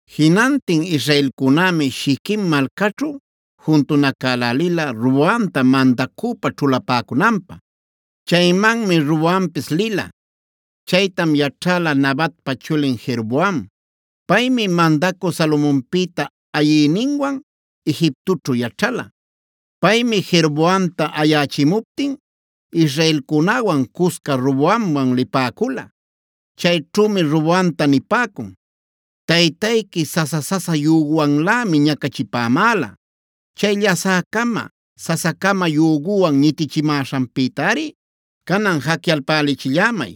Jinantin israelcunämi Shiquem malcaćhu juntunacälälila Roboamta mandacüpa ćhulapäcunanpä. Chaymanmi Roboampis lila. Chaytam yaćhäla Nabatpa chulin Jeroboam. Paymi mandacü Salomonpïta ayïninwan Egiptoćhu yaćhala. Chaymi Jeroboamta ayächimuptin israelcunäwan cusca Roboamman lipäcula. Chayćhümi Roboamta nipäcun: “Taytayqui sasa-sasa yüguwanlämi ñacachipämäla. Chay llasä-cama, sasa-cama yüguwan ñitichimäśhanpïtari canan jacyalpälichillämay.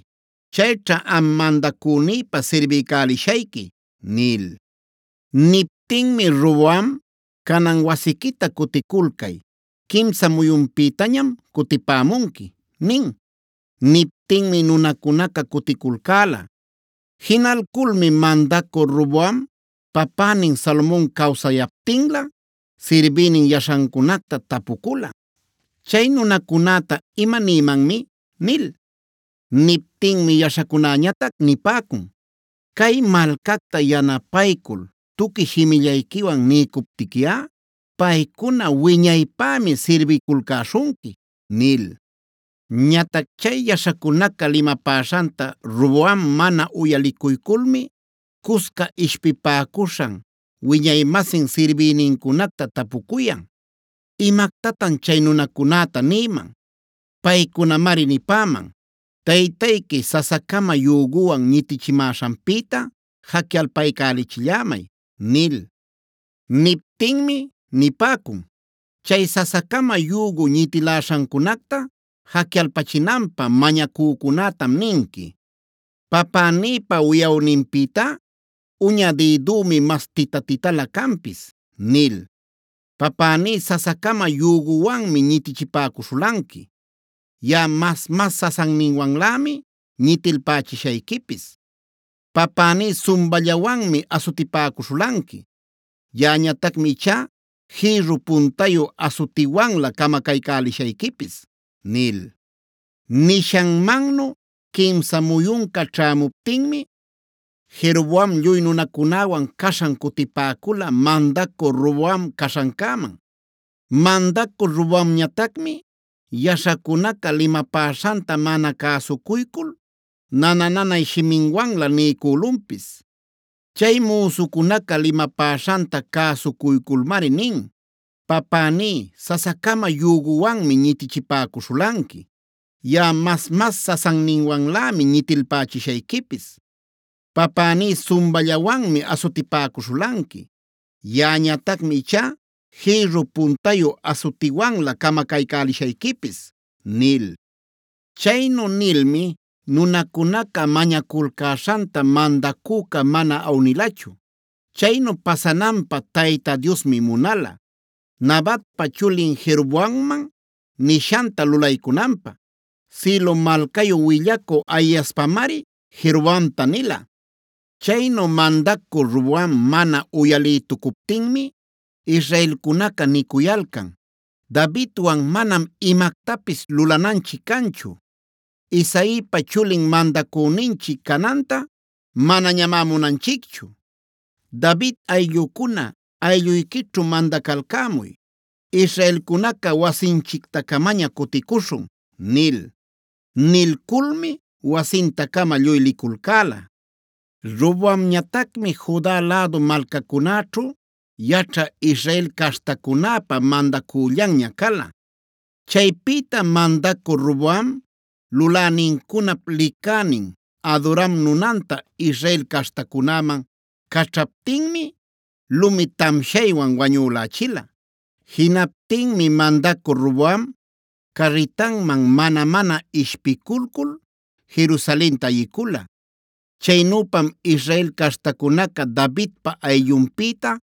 Chayćha am mandacünïta sirbiycälishayqui” nil. Niptinmi Roboam: “Canan wasiquita cuticulcay. Quimsa muyunpïtañam cutipämunqui” nin. Niptinmi nunacunaca cuticulcäla. Jinalculmi mandacü Roboam papänin Salomon cawsayaptinlä sirbïnin yaśhancunacta tapucula: “¿Chay nunacunäta imanïmanmi?” nil. Niptinmi yaśhacunäñatac nipäcun: “Cay malcacta yanapaycul tuqui shimillayquiwan niycuptiquiꞌa paycuna wiñaypämi sirbiculcäśhunqui” nil. Ñatac chay yaśhacunaca limapäśhanta Roboam mana uyalicuyculmi cusca ishpipäcuśhan wiñay-masin sirbïnincunacta tapucuyan: “¿Imactatan chay nunacunäta nïman? Paycunamari nipäman: ‘Taytayqui sasa-cama yüguwan ñitichimäśhanpïta jacyalpaycälichillämay’” nil. Niptinmi nipäcun: “Chay sasa-cama yügu ñitiläśhancunacta jacyalpachinanpä mañacücunätam ninqui: ‘Papänïpa wiꞌawninpïtá uña dïdümi mas tita-titala canpis’ nil. Papäní sasa-cama yüguwanmi ñitichipäcuśhulanqui. Yaꞌa mas-mas sasanninwanlämi ñitilpachishayquipis. Papäní sumballawanmi asutipäcuśhulanqui. Yaꞌañatacmi ichá jïrru puntayu asutiwanlä camacaycälishayquipis” nil. Nishanmannu quimsa muyunca ćhämuptinmi Jeroboam lluy nunacunäwan caśhan cutipäcula mandacü Roboam caśhancäman. Mandacü Roboamñatacmi yaśhacunaca limapäśhanta mana cäsucuycul nana-nanay shimiwanlä niycülunpis. Chay müsucunaca limapäśhanta cäsucuyculmari nin: “Papäní sasa-cama yüguwanmi ñitichipäcuśhulanqui. Yaꞌa mas-mas sasanninwanlämi ñitilpachishayquipis. Papäní sumballawanmi asutipäcuśhulanqui. Yaꞌañatacmi ichá jïrru puntayu asutiwanlä camacaycälishayquipis” nil. Chaynu nilmi nunacunaca mañaculcäśhanta mandacüca mana awnilachu. Chaynu pasananpä Tayta Diosmi munala, Nabatpa chulin Jeroboamman nishanta lulaycunanpä; Silo malcayu willacü Ahiaspamari Jeroboamta nila. Chaynu mandacü Roboam mana uyalïtucuptinmi israelcunaca nicuyalcan: “Davidwan manam imactapis lulananchic canchu. Isaipa chulin mandacüninchic cananta manañamá munanchicchu. ¡David ayllucuna, aylluyquićhu mandacalcämuy! ¡Israelcunaca, wasinchicta-camaña cuticuśhun!” nil.a Nilculmi wasinta-cama lluy liculcäla. Roboamñatacmi Juda lädu malcacunäćhu yaćhä Israel caśhtacunäpä mandacüllanña cala. Chaypïta mandacü Roboam lulänincunap licänin Adoram nunanta Israel caśhtacunäman caćhaptinmi lumi tamshaywan wañülächila. Jinaptinmi mandacü Roboam carritanman mana-mana ishpiculcul Jerusalenta ayicula. Chaynüpam Israel caśhtacunaca Davidpa ayllunpïta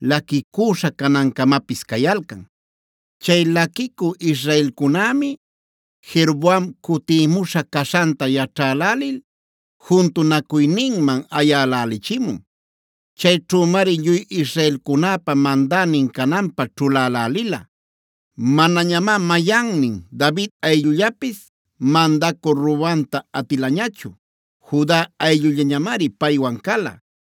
laquicüśha canancamapis cayalcan. Chay laquicü israelcunämi Jeroboam cutïmuśha caśhanta yaćhälälil juntunacuyninman ayälälichimun. Chayćhümari lluy israelcunapä mandänin cananpä ćhulälälila. Manañamá mayannin David ayllullapis mandacü Roboamta atilañachu; Juda ayllullañamari paywan cala.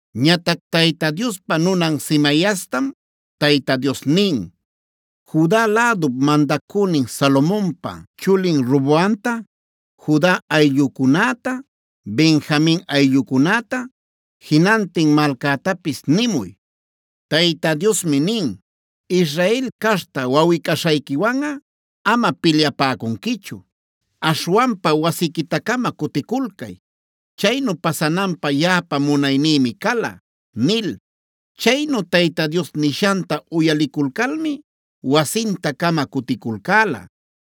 Ñatac Tayta Diospa nunan Semaiastam Tayta Dios nin: “Juda lädup mandacünin Salomonpa chulin Roboamta, Juda ayllucunäta, Benjamin ayllucunäta, jinantin malcätapis nimuy, Tayta Diosmi nin: ‘Israel caśhta wawꞌi-caśhayquiwanꞌa amam pilyapäcunquichu. Aśhwanpa wasiquita-cama cuticulcay. Chaynu pasananpä yaꞌapa munaynïmi cala’” nil. Chaynu Tayta Dios nishanta uyaliculcalmi wasinta-cama cuticulcäla.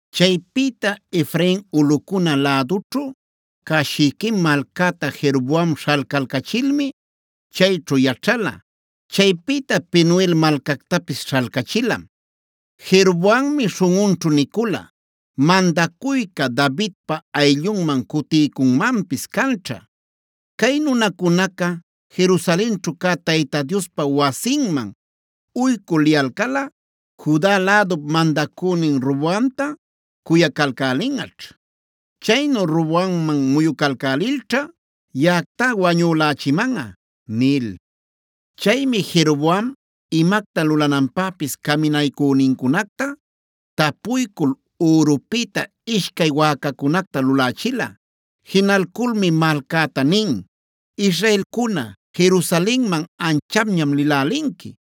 Chaypïta Efrain ulꞌucuna lädućhu cä Shiquem malcäta Jeroboam śhalcalcachilmi chayćhu yaćhala. Chaypïta Penuel malcactapis śhalcachilam. Jeroboammi śhunꞌunćhu nicula: “Mandacuyca Davidpa ayllunman cuticuycunmanpis canćha. Cay nunacunaca Jerusalenćhu cä Tayta Diospa wasinman uycü liyalcalꞌa Juda lädup mandacünin Roboamta cuyacalcälinꞌaćh. Chaynu Roboamman muyucalcälilćha yaꞌactá wañülächimanꞌa” nil. Chaymi Jeroboam imacta lulananpäpis caminaycünincunacta tapuycul ürupïta ishcay wäcacunacta lulächila. Jinalculmi malcäta nin: “Israelcuna, Jerusalenman anchapñam lïlälinqui.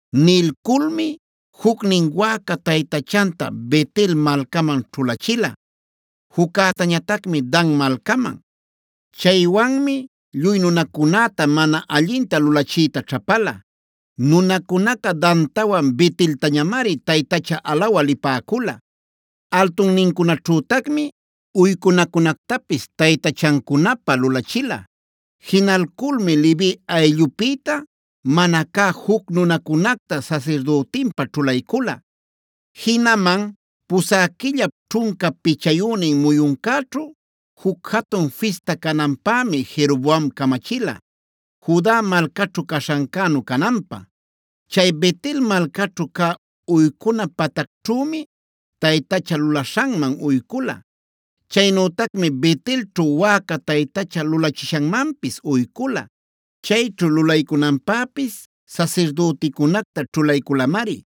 Nilculmi jucnin wäca taytachanta Bet-el malcaman ćhulachila, juccätañatacmi Dan malcaman. Chaywanmi lluy nunacunäta mana allinta lulachiyta ćhapala. Nunacunaca Dantawan Beteltañamari taytacha alawä lipäcula. Altunnincunaćhütacmi uycunacunactapis taytachancunapä lulachila. Jinalculmi Levi ayllupïta mana cä juc nunacunacta sasirdütinpä ćhulaycula. Jinaman pusä quillap ćhunca pichayünin muyuncäćhu juc jatun fista cananpämi Jeroboam camachila; Juda malcaćhu caśhancänu cananpä. Chay Bet-el malcaćhu cä uycuna patacćhümi taytacha lulaśhanman uycula. Chaynütacmi Bet-elćhu wäca taytacha lulachishanmanpis uycula. Chayćhu lulaycunanpäpis sasirdüticunacta ćhulayculamari.